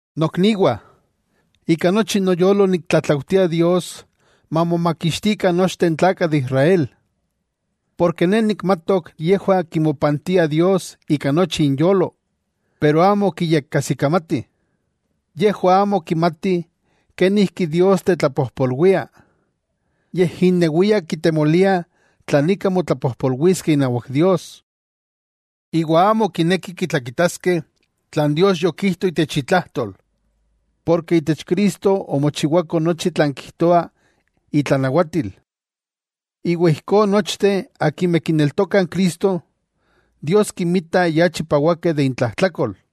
Nokniwah, ika nochi noyolo niktlatlaujtia Dios mamomakixtikah nochteh n tlakah de Israel. Porke ne nikmatok yejwah kimopantiah Dios ika nochi inyolo, pero amo kiyekajsikamatih. Yejwah amo kimatih kenijki Dios tetlapojpolwia, yej innewiah kitemoliah tlan ika motlapojpolwiskeh inawak Dios. Iwa amo kinekih kitlakitaskeh tlan Dios yokijto itech itlajtol. Porke itech Cristo omochiwako nochi tlan kijtoa itlanawatil. Iwa ijkó nochteh akimeh kineltokah n Cristo, Dios kinmita ya chipawakeh de intlajtlakol.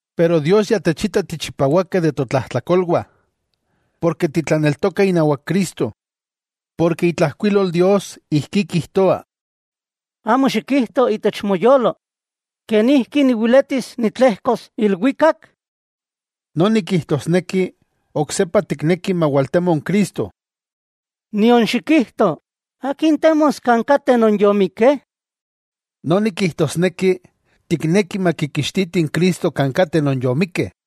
Pero Dios ya techita tichipawakeh de totlajtlakolwah porke titlaneltokah inawak Cristo. Porke itlajkuilol Dios ijkí kijtoa: “Amo xikijto itech moyolo: ¿Kenijki niweletis nitlejkos ilwikak?”, —noni kijtosneki oksepa tikneki mawaltemo n Cristo—, nion xikijto: ¿Akin temos kan kateh non yomikeh? —noni kijtosneki tikneki makikixtitih n Cristo kan kateh non yomikeh.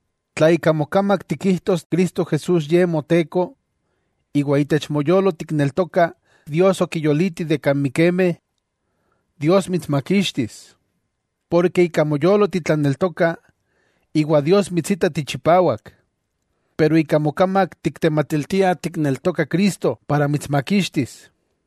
Tla ika mokamak tikijtos Cristo Jesús ye Moteko, iwa itech moyolo tikneltoka Dios okiyoliti de kan mikemeh, Dios mitsmakixtis. Porke ika moyolo titlaneltoka iwa Dios mitsita tichipawak, pero ika mokamak tiktematiltia tikneltoka Cristo para mitsmakixtis.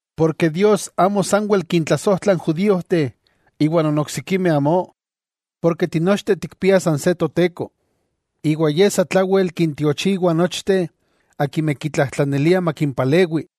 Porke Dios amo sanwel kintlasojtla n judíojteh iwa non oksikimeh amó, porke tinochteh tikpiah san se Toteko. Iwa Ye satlawel kintiochiwa nochteh akimeh kitlajtlaniliah makimpalewi.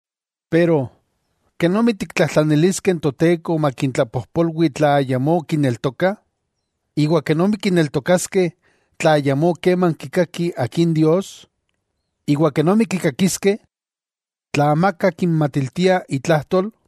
Pero, ¿kenomi kitlajtlaniliskeh n Toteko makintlapojpolwi tla ayamó kineltokah? ¿Iwa kenomi kineltokaskeh, tla ayamó keman kikakih akin Dios? ¿Iwa kenomi kikakiskeh, tla amaka kinmatiltia itlajtol?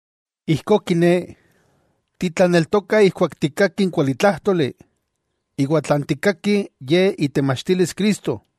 Ijkó kiné, titlaneltokah ijkuak tikkakih n kualitlájtoli, iwa tlan tikkakih, ye itemachtilis Cristo.